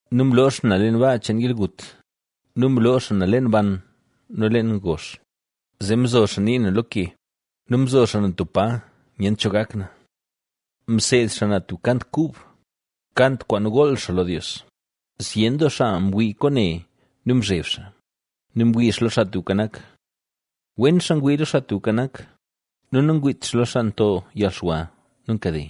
nu mloo xaa na leen baa cheen yalgut nu mloo xaa na leen ban nu leen gozh; zee mzo xaa nii na lo ke nu mzo xaa na tub pa nyent cho gak na. Mseed xaa na tub kant kub, kant kwaan gool xaa lo Dios, zyen doo xaa mwii kwaane nu mzheb xaa nu mwii xaa lo Xaa Tubka Nak. Wen xaa ngwii lo Xaa Tubka Nak nu nangwiit xaa lo xaa nto yalxwa nu nkade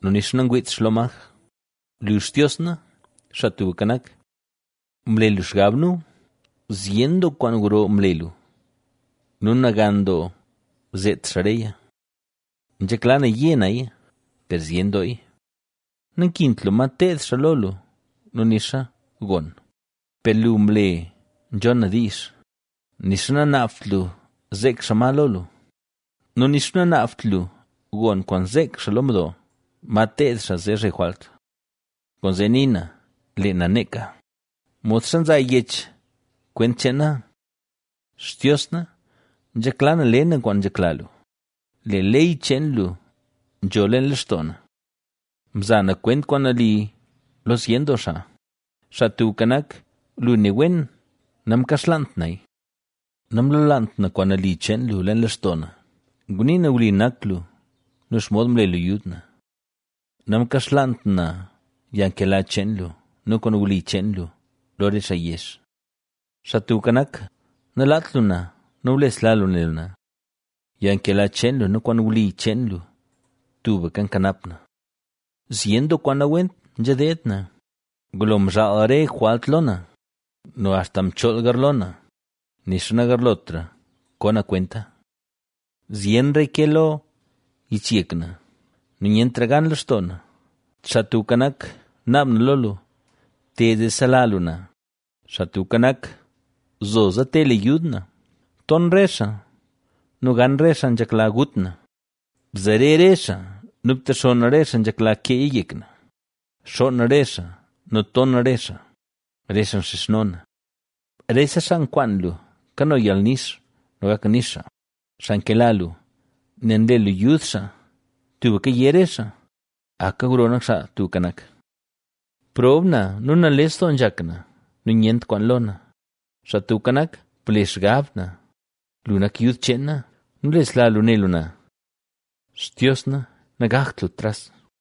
nu nixa nagwiit xaa lo maj. Lu, Xtios na, Xaa Tubka Nak, mle lu xgab nu; zyen doo kwaan gro mle lu nu nagan doo zeet xaa reya nzhekla na yé naya, ¡per zyen dooya! Nankint lu ma teed xaa lo lu nu nixa gon; per lu mle nzhon na diizh; nixa nanaabt lu zeek xaa ma lo lu nu nixa nanaabt lu gon kwaan zeek xaa lo mdo, ma teed xaa zee zhe jwalt. Kwaanzee nii na: “Lee na neeka”; modxa nzaa yech kwent cheen na. Xtios na, nzhekla na le na kwaan nzhekla lu, Lee ley cheen lu nzho leen lextoo na. Mza na kwent kwaan nali lo zyen doo xaa; Xaa Tubka Nak, lu ne wen namkaxlaant naya. Namlolaant na kwaan nali cheen lu leen lextoo na; ngunii na wli nak lu nu xomod mle lu yud na. Namkaxlaant na yalnkela cheen lu nu kwaan wli cheen lu lo re xaa yezh. Xaa Tubka Nak, nalaat lu na nu blesla lu ne lu na; yalnkela cheen lu nu kwaan wli cheen lu tubka nkanap na. Zyen doo kwaan nawent nzha deed na, ngulo mzhaal re jwalt lo na nu axta mchool garlo na, nixa nagarlotra ko na kwenta, zyenraya ke lo yichyek na nu nyentra gan lextoo na. Xaa Tubka Nak, naab na lo lu: “¡Te, zee sela lu na!” Xaa Tubka Nak, ¡zoza te le yud na! Ton re xaa nu gan re xaa nzhekla gut na; bzare re xaa nu btexonn re xaa nzhekla keeya yek na; xoon re xaa nu ton re xaa, re xaa nxizhno na. Rese xaa nkwaan lu kano yalnix nu gak nix xaa, xaa nkela lu, nel nle lu yud xaa tubka yé re xaa, “¡Aka gro nak Xaa Tubka Nak!” Prob na nu nales doo nzhak na nu nyent kwaan lo na, Xaa Tubka Nak, ble xgab na, lu nak yud cheen na nu nlesla lu ne lu na. ¡Xtios na nagakt lu tras!